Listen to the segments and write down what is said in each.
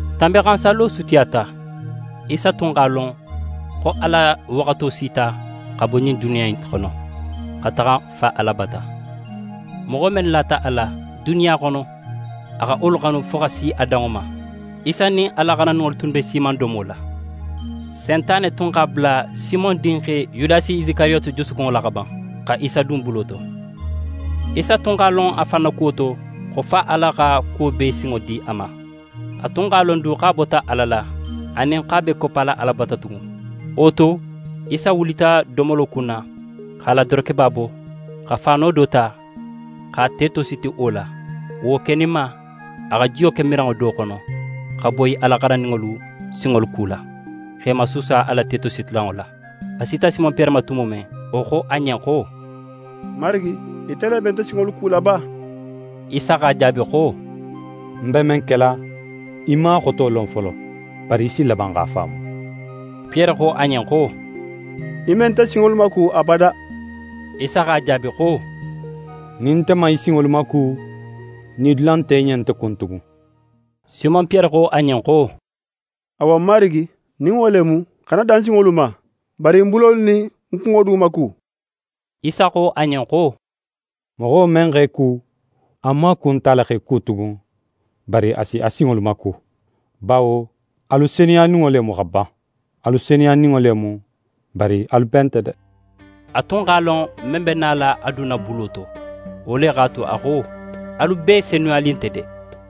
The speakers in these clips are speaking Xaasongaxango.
Tanbinxansallo sutiyata. Isa tun x'a lon xo a la waxato sita, xa bo ɲin duniya in xono, xa taxa Fa Ala bata. Moxo mennu lata a la, duniya xono, a xa wolu xanu fo xa si a danŋo ma. Isa nin a la xarandinŋolu tunnu be siimandomo la. Sentane tun x'a bula Simon dinxe Yudasi Isikariyoti jusukunŋo la xa ban, xa Isa dun bulo to. Isa tun x'a lon a fan na kuwo to, xo Fa Ala xa kuwo bee sinŋo di a ma, a tun x'a lon du xo a bota Ala la, anin xo a b'é koppala Ala bata tugun. Wo to, Isa wulita domolo kunna, x'a la dorokeba bo, xa faano do ta, x'a te tositi wo la. Wo keninma, a xa jiyo ke miranŋo do xono, xa boyi a la xarandinŋolu sinŋolu kula, x'e masuusa a la wo tetositilanŋo la. A sita Simon Piyere ma tumo men, wo xo a ɲen xo: «Marigi, ite le be nte sinŋolu kula ba?» Isa x'a jaabi xo: «Ń be men kela, í man a xoto lon folo, bari í si laban x'a faamu.» Piyere xo a ɲen xo: «Í me nte sinŋolu maku abada.» Isa x'a jaabi xo: «Nin nte man í sinŋolu maku, nidula nte í ɲen nte kun tugun.» Simon Piyere xo a ɲen xo: «Awa Marigi, nin wo le mu, xana dan ń sinŋolu ma, bari ń bulolu nin ń kunŋo du maku.» Isa xo a ɲen xo: «Moxo men x'é ku, a maaku nt'a la x'é ku tugun, bari a si a sinŋolu maku. Bawo alu senuyaninŋo le mu xa ban. Alu senuyaninŋo le mu, bari alu bee nte de.» A tun x'a lon, men be nala a dunna bulo to. Wo le x'a tu a xo: «Alu bee senuyanin nte de.»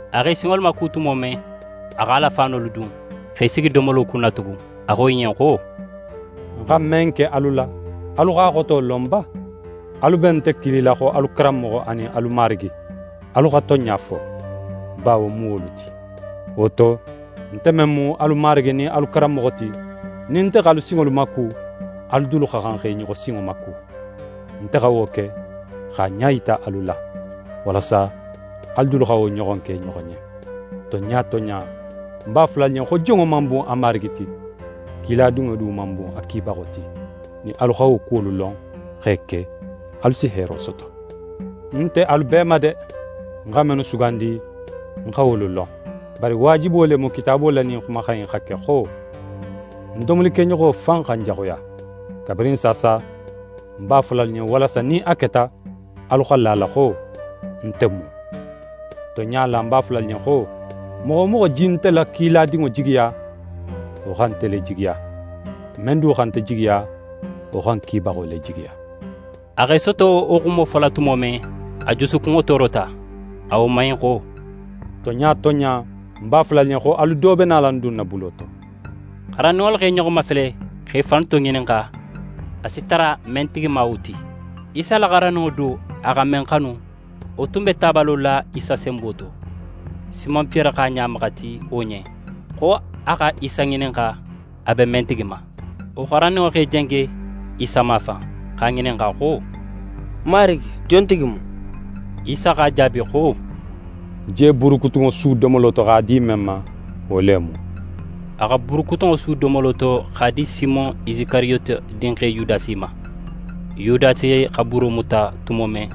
A x'e sinŋolu maku tumo men, a x'a la faanolu dun, x'é sigi domolo kunna tugun. A xo i ɲen xo: «Ń xa men ke alu la, alu x'a xoto lon ba? Alu be nte kilila xo alu Karanmoxo anin alu Marigi. Alu xa tonɲa fo, bawo ń mu wolu ti. Wo to, nte men mu alu Marigi nin alu Karanmoxo ti, nin nte x'alu sinŋolu maku, alu dulu xa xan xa i ɲoxo sinŋo maku. Nte xa wo ke, x'a ɲa yita alu la, walasa alu dulu xa wo ɲoxon ke i ɲoxo ɲen. Tonɲa tonɲa, ń b'a fola alu ɲen xo jonŋo man bun a marigi ti, kiladinŋo du man bun a kibaxo ti. Nin alu xa wo kuwolu lon, x'e ke, alu si heero soto. Ń nte alu bee ma de; ń xa mennu sugandi, ń xa wolu lon. Bari waajibo le mu Kitaabo la ɲin xumaxan in xa ke xo: “Ń domolikeɲoxo fan xa ń jaxuya.” Kabirin saasa, ń b'a fola alu ɲen, walasa nin a keta, alu xa la a la xo: “Nte mu”. Tonɲa la, ń b'a fola alu ɲen xo: Moxo wo moxo je nte la kiladinŋo jigiya, wo xa nte le jigiya; men du xa nte jigiya, wo xa ń kibaxo le jigiya.» A x'é soto wo xumo fola tumo men, a jusukunŋo toorota. A woman in xo: «Tonɲa tonɲa, ń b'a fola alu ɲen xo, alu do be nala ń dunna bulo to.» xarandinŋolu x'e ɲoxo mafele, x'e fannu toŋininxa, a si tara men tigi ma wo ti. Isa la xarandinŋo do, a xa men xanu, wo tun be tabalo la Isa senbo to. Simon Piyere x'a ɲa maxati wo ɲen, xo a xa Isa ŋininxa, a be men tigi ma. Wo xarandinŋo x'e jenge Isa mafan, x'a ŋininxa xo: «Marigi, jontigi mu?» Isa x'a jaabi xo: «Ń je buurukutunŋo su domolo to x'a di men ma, wo le mu.» A xa buurukutunŋo su domolo to, x'a di Simon Isikariyoti dinxe Yudasi ma. Yudasi xa buuro muta tumo men,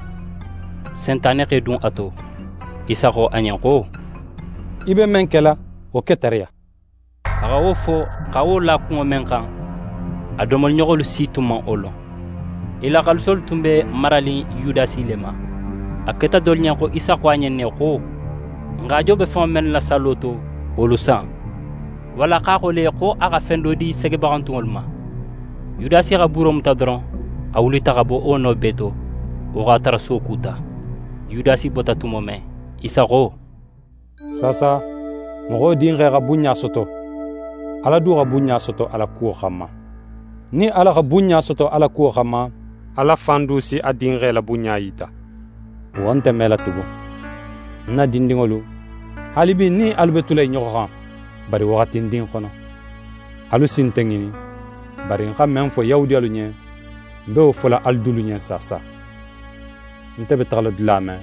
Sentane x'é dun a to. Isa xo a ɲen xo: «Í be men kela, wo ke tariya.» A xa wo fo, xa wo la kunŋo men xan, a domoliɲoxolu si tun man wo lon. I la xaaliso tun be maranin Yudasi le ma. A keta dolu ɲen xo Isa xo a ɲen ne xo: «N haajo be fenŋo mennu la sallo to, wolu san!» Walla x'a xo le, xo a xa fen do di segebaxantunŋolu ma. Yudasi xa buuro muta doron, a wulita xa bo wo no bee to. Wo x'a tara suwo kuta. Yudasi bota tumo men, Isa xo: «Saasa, Moxo Dinxe xa bunɲa soto, Ala du xa bunɲa soto a la kuwo xanma. Nin Ala xa bunɲa soto a la kuwo xanma, Ala fan du si a Dinxe la bunɲa yita. Wo nte mela tugun. Ń na dindinŋolu, haalibi, ń nin alu be tula í ɲoxo xan, bari waxatindin xono. Alu si nte ŋinin, bari, ń xa men fo Yahudiyalu ɲen, ń be wo fola alu dulu ɲen saasa: Nte be taxala dula men,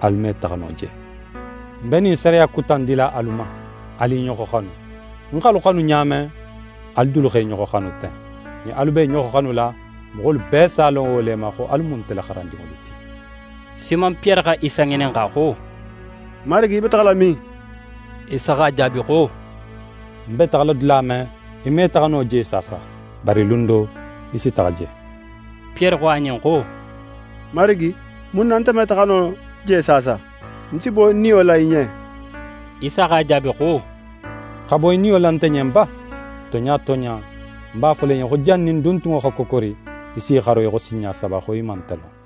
alu me taxa no je. Ń be ɲin sariya kuta in dila alu ma: Alu i ɲoxo xanu! Ń x'alu xanu ɲa men, alu dulu x'e ɲoxo xanu ten. Nin alu be i ɲoxo xanula, moxolu bee s'a lon wo le ma, xo alu mu nte la xarandinŋolu ti.» Simon Piyere xa Isa ŋininxa xo: «Marigi, í be taxala min?» Isa x'a jaabi xo: «Ń be taxala dula men, í me taxa no je saasa, bari lun do, í si taxa je.» Piyere xo a ɲen xo: «Marigi, mun na nin nte me taxa no je saasa? Ń si bo ń niyo la í ɲen.» Isa x'a jaabi xo: «Xa bo í niyo la nte ɲen ba? Tonɲa tonɲa, ń b'a fola í ɲen xo, jannin duntunŋo xa kokori, í s'í xaro í xo sinɲa saba, xo í man nte lon.»